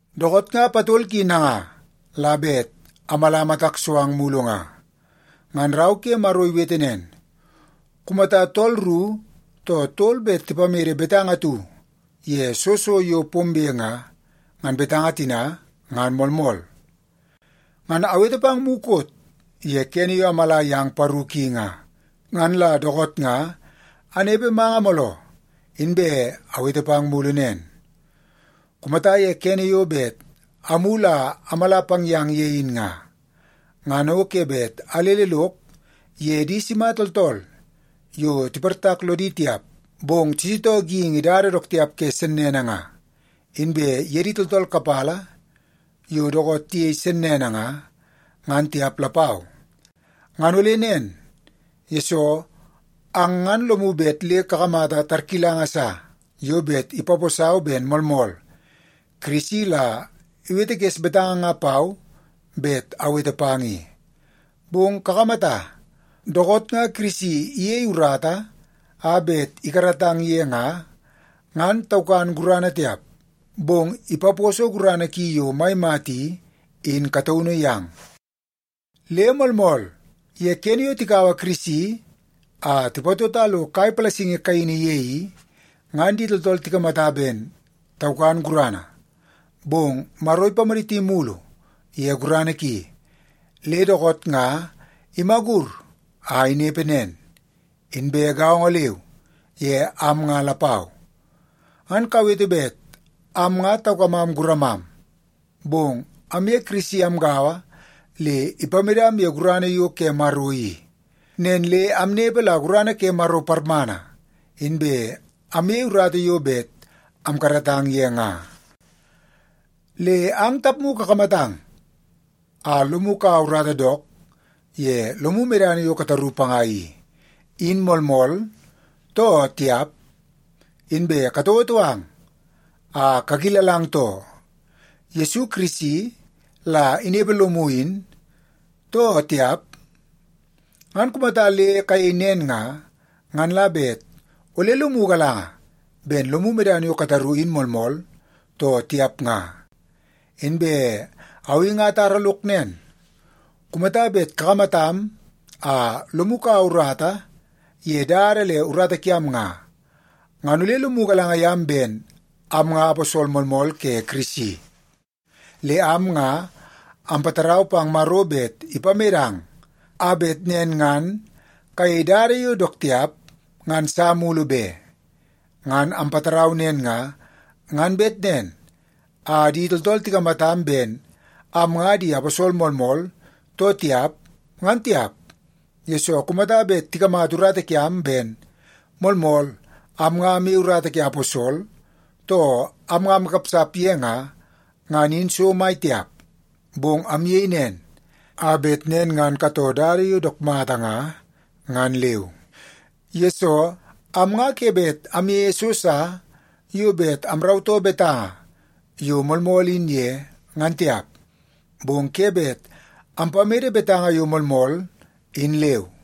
Dookoot nga patol ki nanga la bet amala matak so ang mulu nga. Ngan rau ke Maro iwete nen, “Kumata tool ru too tol bet tipamede betanga atu ye soo so yo pombe nga, ngan betanga tina ngan moolmool.” Ngan awete pang mukot ye kene yo amala yang paru ki nga. Ngan la dookoot nga anepe manga mooloo, inbe awete pang mulu nen. Kumata ye kene yo bet amulu a amala pang yang ye in nga, ngan o ke bet alele lok ye di sima tooltool yo tiportak lodi tiap bong tisitoo geingi dada dook tiap ke sennene nga, inbe ye di tooltool kapala yo dookoot tiyei sennene nga, ngan tiap lapau. Ngan ole nen, yesoo ang ngan lomu bet le kakamata tarkilanga sa yo bet ipaposau ben moolmool Kirisi la iwetekes betanga nga pau bet awete pang i. Bong kakamata, dookoot nga Kirisi iyei urata a bet ikaratang ye nga, ngan taukan gurana tiap, bong ipaposo gurana ki yo mai mata i, in kataunu yang. Le moolmool, ye kene yo tikaua Kirisi a tipatota lo kai palasingi kaini ye i, ngan di tooltool tikamata ben taukan gurana, bong Maro ipamaditi mulu ye gurana ki, le dookoot nga imagur a inepe nen. Inbe gaongo leu ye am nga lapau. Ngan kawete bet am nga taukamam guramam, bong amye Kirisi amgaua le ipamedam ye gurana yo ke Maro i. Nen le amnepe la gurana ke Maro parmana, inbe amyei urata yo bet amkaratang ye nga. Le ang tapmu kakamatang a lomu kaua urata dook ye lomu medana yo kataru panga i, in moolmool, too tiap? Inbe katouotou ang a kakilalang too, Yesu Kirisi la inepe lomu in, too tiap? Ngan kumata le kayei nen nga, ngan la bet ole lomu galanga ben lomu medana yo kataru in moolmool, too tiap nga. Inbe au i atara lok nen, kumata bet kakamatam a lomu kaua urata ye dada le urata kiam nga, ngan ole lomu galanga yam ben am nga aposol moolmool ke Kirisi. Le am nga ampatarau pang Maro bet ipamedang, a bet nen ngan kayei dada yo dook tiap ngan sa mulu be. Ngan ampatarau nen nga, ngan bet nen a di tooltool tikamatam ben am nga di aposol moolmool too tiap, ngan tiap, yesoo kumata bet tikamata urata kiam ben moolmool am nga amyei urata ke aposol, too am nga amkapsap ye nga, ngan in so mai tiap. Bong amyei nen, a bet nen ngan katoo dada yo dook mata nga, ngan leu. Yesoo, am nga ke bet amyeie so sa yo bet amrautoo betanga yo moolmool in ye, ngan tiap. Bong ke bet ampamede betanga yo moolmool in leu.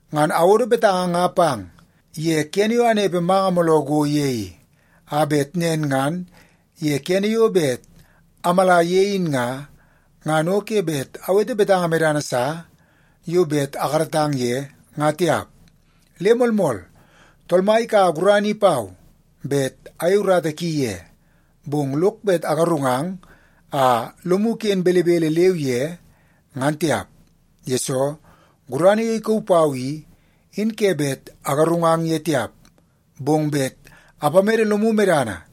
Ngan awodo betanga nga pang ye kene yo anepe manga mooloo go ye i, a bet nen ngan ye kene yo bet amala ye in nga, ngan o ke bet awete betanga medana sa yo bet akaratang ye nga tiap. Le moolmool, Tool Mai ikaua gurana i pau bet ayei urata ki ye, bong lok bet agarungang a lomu ken belebele leu ye, ngan tiap. Yesoo, gurana yo ikauu pau i, in ke bet agarungang ye tiap, bong bet apamede lomu medana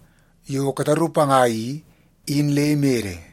yo kataru panga i, in le imede.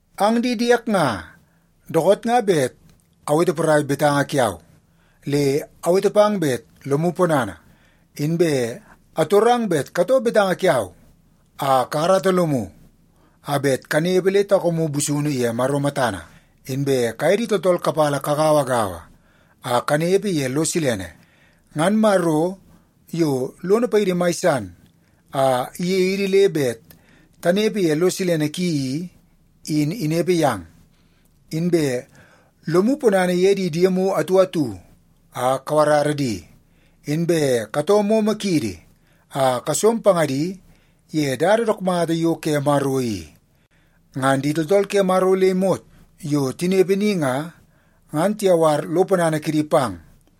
Ang di diek nga, dookoot nga bet awete porai betanga kiau, le awete pang bet lomu ponana. Inbe atorang bet katoo betanga kiau a kakarata lomu a bet kanepe le taukamu busunu ye Maro matana. Inbe kaye di tooltool kapala kagauagaua a kanepe ye lo silene. Ngan Maro, yo lono paidi mai san a iyei idi bet tanepe ye lo silene ki i, in inepe yang. Inbe lomu ponana ye di diemu atu atu a kawarara di, inbe katoo momo kiidi a kasom pangadi ye dada dook mata yo ke Maro i. Ngan di tooltool ke Maro le imot yo tinepe ni nga, ngan tiyawar lo ponana kidi pang.